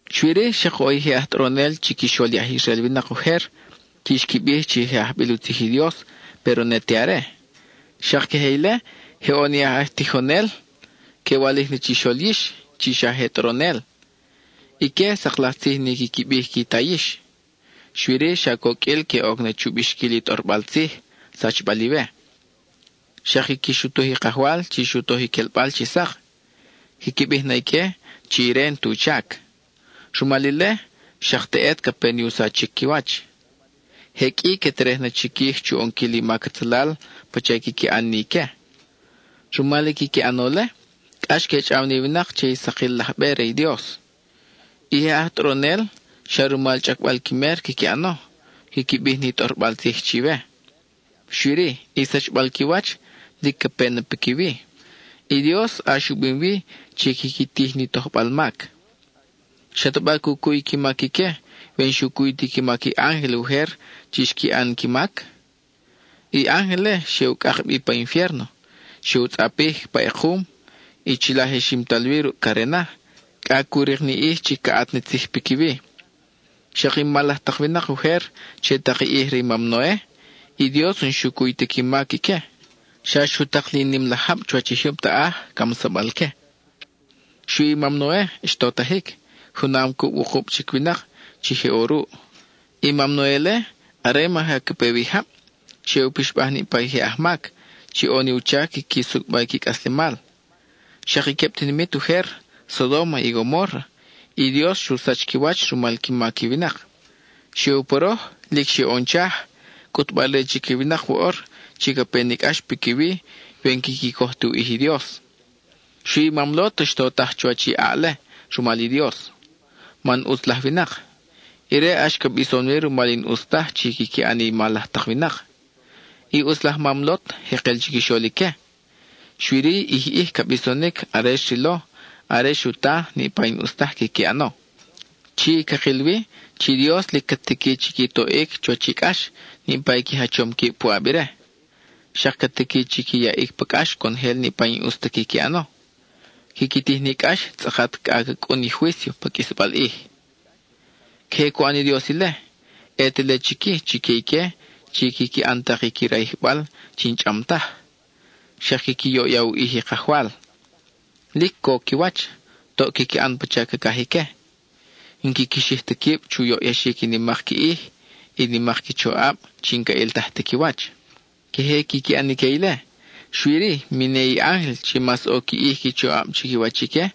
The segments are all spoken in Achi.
Xui-ri, xak ʼo i je aj tʼoronel chiquixol i aj Israel winak ujer chi xqui bij chi je ajbil u tzij i Dios, péro ne te are. Xak queje ile, je ʼo ni aj tijonel que walij na chixol yix chi xa je tʼoronel. Ique, sak laj tzij ni quiqui bij qui ta yix; xui-ri xa coqʼuil que oc na chu bixquil i tʼorbal tzij, sachbal iwe. Xak quiqui xutuj i Kajwal chi xu toj i quelbal chi sak (quiqui bij na ique chi ire n-tu chac); rumal ile, xak teʼet ca pe ni u sachic qui wach. Je qʼui que terej na chiquij chu ʼonquil i mac atzalal pacha i quiqui ʼan ni ique. Rumal i quiqui ʼano-le, cʼax que chʼaw ni winak che i sakil laj be re i Dios. I je aj tʼoronel, xa rumal chʼacbal qui mer quiqui ʼano, quiqui bij ni tʼorbal tzij chiwe. Xui-ri, i sachbal qui wach lic ca pe na piquiwi; i Dios ʼax u bim wi chi quiqui tij ni tojbal mac. ¿Xataba cu cuy qui mac ique we n-xu cuy ti qui mac i ángel ujer chi xqui ʼan qui mac? I ángel-le xe u cʼak bi pa infiérno, xe u tzʼapij pa ʼekum; chila je ximtal wi ruʼ carena, cʼa cu rik ni ʼij chi ca ʼat na tzij piquiwi. Xak i mal laj tak winak ujer che tak i ʼij re i mam Noe, i Dios n-xu cuy ta qui mac ique; xa xu tak li nim laj jab chuwach i jyub taʼaj, camsabal que. Xui i mam Noe xtotajic, junam cuʼ wukub chic winak chi je ʼo ruʼ. I mam Noe-le, are maja ca pe wi i jab, xe u pixbaj niʼpa i je ajmac chi ʼo ni u chac quiqui sucʼba qui cʼaslemal. Xak i queb tinimit ujer, Sodóma y Gomórra, i Dios xu sach qui wach rumal qui mac i winak. Xe u poroj, lic xe u ʼon chaj, cʼutbal-re chique i winak woʼor chi ca pe ni cʼax piquiwi we n-quiqui coj ti u ʼij i Dios. Xui i mam Lot xtotaj chuwach i ʼaʼ-le rumal i Dios, man ʼutz laj winak; ire ʼax ca bison-wi rumal i n-ʼus taj chi quiqui ʼan i mal laj tak winak. I ʼutz laj mam Lot jekel chiquixol ique, xui-ri ʼij ʼij, ca bisonic are xrilo, are xu ta, niʼpa i n-ʼus taj quiqui ʼano. Chi, cakil wi chi i Dios lic ca tiqui chi qui toʼic chuwach i cʼax niʼpa i qui jachom quib puʼab ire. Xak ca tiqui chi qui yaʼic pa cʼax conojel niʼpa i n-ʼus ta quiqui ʼano, quiqui tij ni cʼax tzʼakat cʼa ca cʼun i juício pa qʼuisbal ʼij. Queje cu ʼan ni Dios ile, ʼe te le chic-i chique ique chi quiqui ʼan tak i qui rayijbal chi n-chʼam taj, xak quiqui yoʼya u ʼij i Kajwal. Lic co qui wach, toʼ quiqui ʼan pacha cacaj ique; n-quiqui xij ta quib chu yoʼyaxic i nimak qui ʼij, i nimak qui choʼab chi n-ca ʼiltaj ti qui wach. Queje quiqui ʼan ique ile, xui-ri, mi ne i ángel chi mas ʼo qui ʼij qui choʼab chiquiwach ique,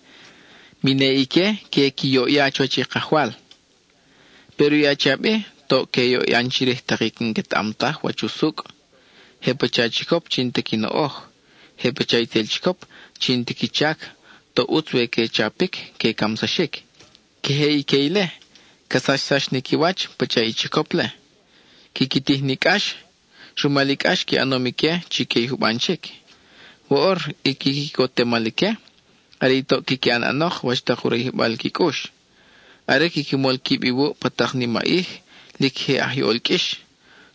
mi ne ique que qui yoʼya chuwach i Kajwal. Péro i achiab-i toʼ que yoʼyan chirij tak i n-quetaʼam taj wach usucʼ. Je pacha chicop chi n-ta qui noʼoj; je pacha itzel chicop chi n-ti qui chac, toʼ ʼutz we que chapic, que camsaxic. Queje ique ile, ca sachsax ni qui wach pacha i chicop-le. Quiqui tij ni cʼax, rumal i cʼax qui ʼanom ique chique i juban chic. Woʼor, i qui quicotemal ique are i toʼ quiqui ʼan ʼanok wach tak u rayijbal qui cʼux. Are quiqui mol quib iwuʼ pa tak nimaʼij, lic je ajyol qʼuix;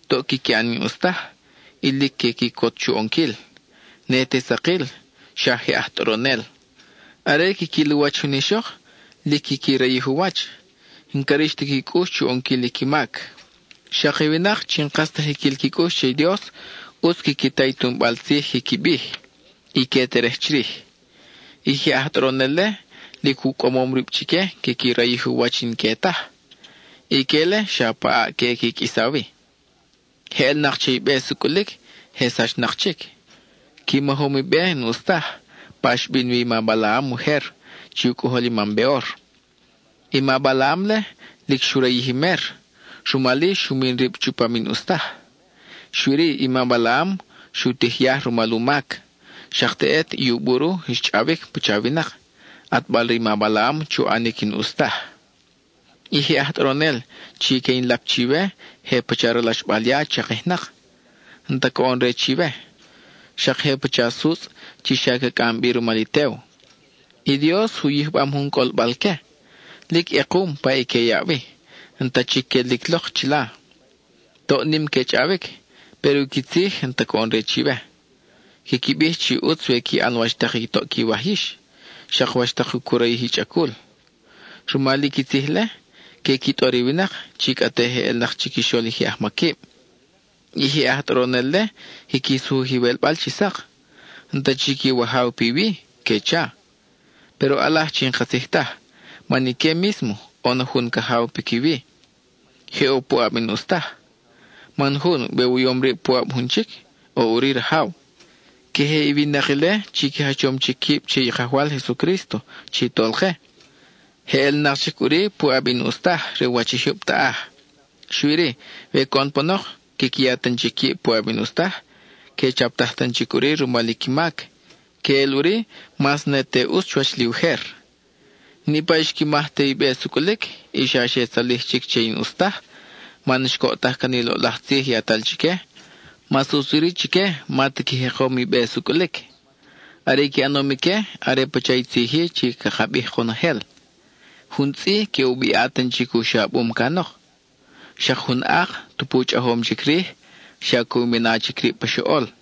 toʼ quiqui ʼan i n-ʼus taj, y lic que quicot chu ʼonquil. (Ne te sakil, xa je aj tʼoronel.) Are quiquil u wach jun ixok, lic quiqui rayij u wach; n-ca rix ta qui cʼux chu ʼonquil i qui mac. Xak i winak chi n-kas ta jiquil qui cʼux che i Dios, ʼutz quiqui ta i tunbal tzij quiqui bij, y que terej chirij. I je aj tʼoronel-le lic u cʼamom rib chique quiqui rayij u wach i n-que taj; ique-le, xa pa ʼaʼ que ʼe qui qʼuisa wi. Je ʼelnak che i be sucʼulic, je sachnak chic. Qui majom i be n-ʼus taj, pa xbin wi i ma Balaam ujer, chi u cʼojol i mam Beor. I ma Balaam-le, lic xu rayij i mer, rumal-i, xu min rib chupam i n-ʼus taj. Xui-ri, i ma Balaam xu tij yaj rumal u mac. Xak teʼet i u buru xchʼawic pacha winak, ʼatbal re i ma Balaam chu ʼanic i n-ʼus taj. I je aj tʼoronel chi que in lap chiwe je pacha ralaxbal ya chakijnak; n-ta coʼon-re chiwe. Xak je pacha sutzʼ chi xa ca cʼam bi rumal i tew. I Dios u yijbam jun cʼolbal-que, lic ʼekum pa i que yaʼ wi; n-ta chic quelic lok chila. Toʼ nim que chʼawic, péro i qui tzij n-ta coʼon-re chiwe. Quiqui bij chi ʼutz we qui ʼan wach tak i toʼ quiwaj yix, xak wach tak cu rayij i chʼacul. Rumal i qui tzij-le, que qui tʼor i winak chi cʼa te je ʼelnak chiquixol i je ajmaquib. I je aj tʼoronel-le quiqui sujuj iwelbal chi sak: “N-ta chic iwajaw piwi,” que cha. Péro ʼalaj chi n-katzij taj, man ique mísmo ʼo na jun cajaw piquiwi; je ʼo puʼab i n-ʼus taj. Man jun, we u yom rib puʼab jun chic, ʼo ʼuri rajaw. Queje i winak ile chi qui jachom chic quib che i Kajwal Jesucrísto chi Tolke, je ʼelnak chic ʼuri puʼab i n-ʼus taj re u wach i jyub taʼaj. Xui-ri, we coʼon panok quiqui ya tan chic quib puʼab i n-ʼus taj, que chaptaj tan chic ʼuri rumal i qui mac, que ʼel ʼuri mas ne te ʼutz chuwach li ujer. Niʼpa i xqui maj te i be sucʼulic, y xa xe tzalij chic che i n-ʼus taj man xcoʼtaj can i loʼlaj tzij yatal chique, mas ʼutz ʼuri chique ma ta qui jekom i be sucʼulic. Are i qui ʼanom ique are pacha i tzij-i chi caka bij konojel: “Jun tzʼi que u biʼa tan chic u xabum canok; xak jun ak, tupu chʼajom chic rij, xa que u mina chic rib pa xoʼol.”